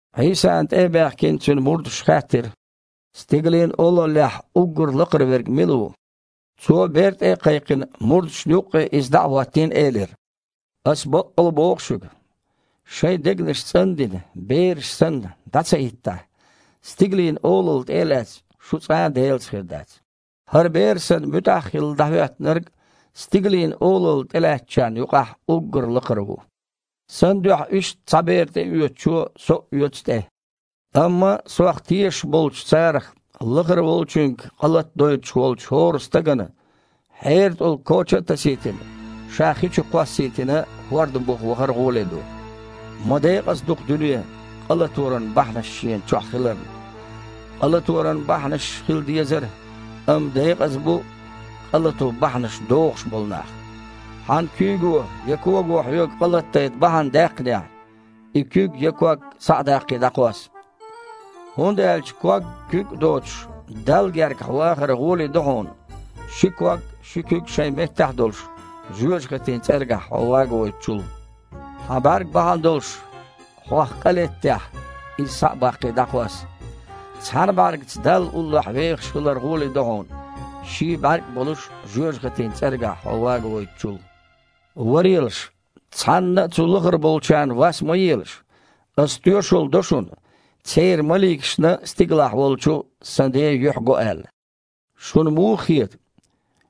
Іийсана тІе а баьхкина, Цуьнан мурдаша хаьттира: «Стигалийн Олаллехь уггар лакхара верг мила ву?» Цо, бер тІе а кхайкхина, мурдашна юккъе иза дІа а хІоттийна, элира: «Аса баккъалла боху шуьга: шайн дегнаш цІан а дина, бераш санна дІа ца хІиттахь, Стигалийн Олалла тІе а лаьцна, шу цкъа а Делаца хир дац. ХІара бер санна, муьтІахь а хилла, дІахІоьттинарг Стигалийн Олалла тІелаьцначарна юкъахь уггар лакхара ву. Сан дуьхьа иштта цхьа бер тІеоьцучо Со а оьцу тІе». «Амма Сох тешаш болчу царах лахара волчуьнга къа латадойтуш волчу хІора стагана, хьеран тІулг коча а тасийтина, ша хи чу а кхоссийтина, хІорда буха вахар гІоле ду. Ма декъаза ду-кх дуьне, къа латоран бахьанаш шена чохь хиларна. Къа латоран бахьанаш хила дезара, амма декъаза бу къа лато бахьанаш дохуш болу нах. Хьан куьйго я кого хьоьга къа латадайта бахьана даьккхинехь, и куьг я ког, схьа а даккхий, дІакхосса. ХІунда аьлча ког-куьг а доцуш Далла гергахь вахар гІоле ду хьуна, ши ког а, ши куьг а шайн меттехь а долуш, жоьжахатин цІергахь хьо вагавойтучул. Хьан бІаьрг бахьана долуш хьох къа леттехь, иза, схьа а баккхий, дІакхосса. Цхьана бІаьргаца Далла уллохь вехаш хилар гІоле ду хьуна, ший а бІаьрг а болуш, жоьжахатин цІергахь хьо вагавойтучул». «Варелаш, цхьанна а цу лахара болчарна вас ма елаш. Аса тоьшалла до шуна, церан маликашна стигалахь волчу Сан Ден юьхь го аьлла. Шуна муха хета?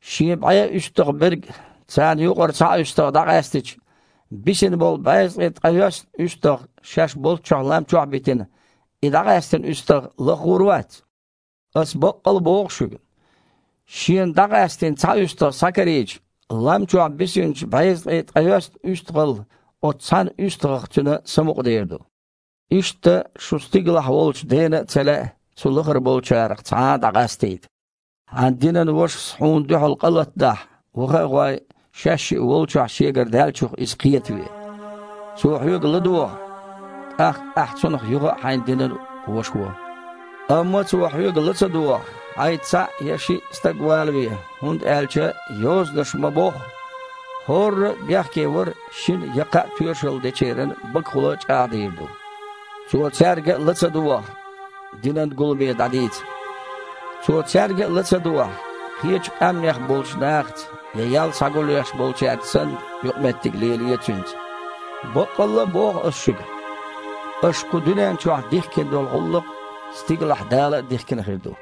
Шен бІе уьстагІ берг, царна юкъара цхьа уьстагІ дІакъаьстича, бисина болу безткъе ткъайоьсна уьстагІ шаьш болчохь лам чохь а битина, и дІакъаьстина уьстагІ лаха гІур вац? Ас баккъалла а боху шуьга: шена дІакъаьстина цхьа уьстагІ схьакарийча, лам чохь бисинчу безткъе ткъайоьсна уьстагІал оцу цхьана уьстагІах цуьнан самукъадер ду. Иштта шун стигалахь волчу Дена а ца лаьа цу лахара болчарах цхьа а дІакъастийта». «Хьан динан вашас хьуна дуьхьал къа латадахь, ваха а гІой, шаьшшиъ волчохь шегара даьллачух иза кхетаве. Цо хьоьга ладогІахь, тІаккха ахьа цунах юха а хьайн динан ваша во. Амма цо хьоьга ла ца догІахь, хьайца цхьаъ я шиъ стаг валаве, хІунда аьлча Йозанаша ма-бохху: „ХІорра а бехкевар шина я кхаа тоьшалла дечеран багахула чІагІдийр ду“. Цо цаьрга а ла ца догІахь, динан гуламе дІадийца. Цо цаьрга а ла ца догІахь, кхечу къаьмнех болчу нахаца я ял схьагулъеш болчаьрца санна, юкъаметтиг лелае цуьнца. Баккъалла а боху Ас шуьга: аша кху дуьнен чохь дихкина долу гІуллакх стигалахь Дала а дихкина хир ду.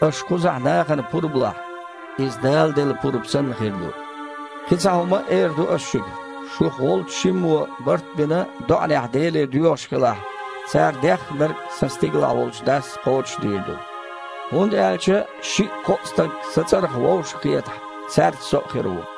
Аша кхузахь нахана пурба лахь, иза Дала делла пурба санна хир ду. Кхин цхьа хІума а эр ду Аса шуьга: шух волчу шиммо, барт а бина, доІанехь Деле доьхуш хилахь, цара деххнарг Сан стигалахь волчу Дас кхочушдийр ду. ХІунда аьлча шиъ-кхоъ стаг Сан цІарах вовшахкхетахь, цаьрца Со а хир ву».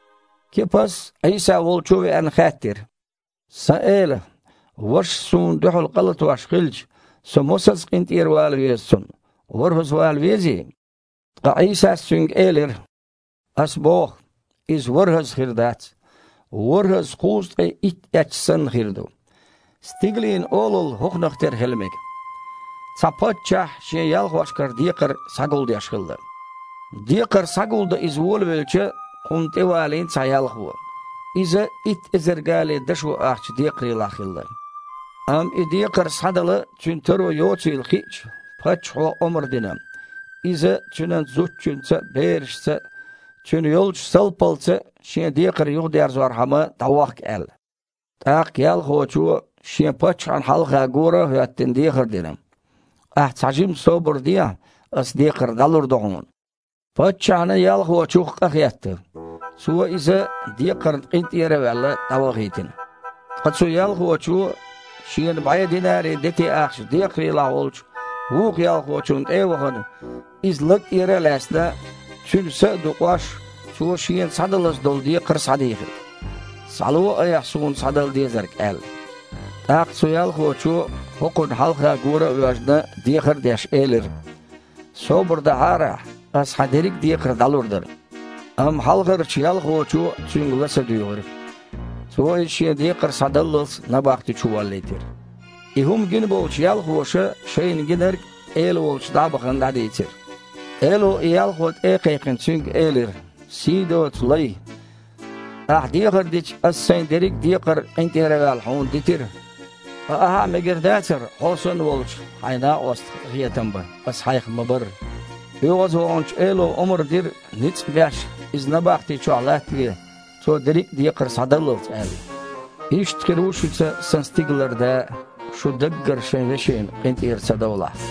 Кипас, Іийса волчу а веана, хаьттира: «Сан Эла! Вашас суна дуьхьал къа латош хилча, со мосазза къинтІера вала веза цунна? ВорхІазза вала везий?» Ткъа Іийсас цуьнга элира: «Аса боху: иза ворхІазза хир дац, ворхІазза кхузткъе итт эцча санна, хир ду. Стигалийн Олалла хІокхунах тера хила мега. Цхьа паччахь шен ялхошкара декхар схьагулдеш хилла. Декхар схьагулдан иза волавелча, кхунна тІевалийна цхьа ялхо. Иза итт эзар гали дашо ахча декхарийлахь хилла. Амма и декхар схьадала цуьнан таро йоцийла хиъча, паччахьо омра дина, иза цуьнан зудчуьнца а, берашца а, цуьнан йолчу салпалца а шен декхар юхадерзорхьама дІавохка аьлла. ТІаккха ялхочо, шен паччахьна хьалха гора а хІоьттина, дехар дина: „Ахьа цхьажимма собар дехьа, аса декхар дІалур ду хьуна!“ Паччахьна ялхочух къахетта. Цо иза, декхарна къинтІера а ваьлла, дІавахийтина. Ткъа цу ялхочо, шена бІе динари дети-ахча декхарийлахь волчу вукху ялхочунна тІе а вахана, иза лаг тІера а лаьцна, цуьнан са а дукъош, цо шена схьадалаза долу декхар схьадийхира: „Схьало айхьа суна схьадала дезарг!“ – аьлла. ТІаккха цу ялхочо, хІокхунна хьалха гора а воьжна, дехар а деш, элира: „Собар дахьара ахьа, аса хьан дерриг а декхар дІалур дара“. Амма хьалхарчу ялхочо цуьнга ла ца дуьйгІира. Цо иза шен декхар схьадаллалц набахти чу воллийтира. И хІума гина болчу ялхоша шайна гинарг, эла волчу дІа а бахана, дІадийцира. Эло, и ялхо тІе а кхайкхина, цуьнга элира: „Сий доцу лай! Ахьа дехар дича, аса сайн дерриг а декхар, къинтІера а ваьлла, хьуна дитира. Ткъа ахьа а мегар дацара хьо санна волчу хьайн накъостах къинхетам бан, аса хьайх ма-барра?“ ОьгІазваханчу эло омра дира, ницкъ а беш, иза набахти чохь латтаве, цо дерриг а декхар схьадаллалц, аьлла. Иштта хир ву шуьца Сан Стигалара Да а, шу даггара шайн вешина къинтІера ца довлахь».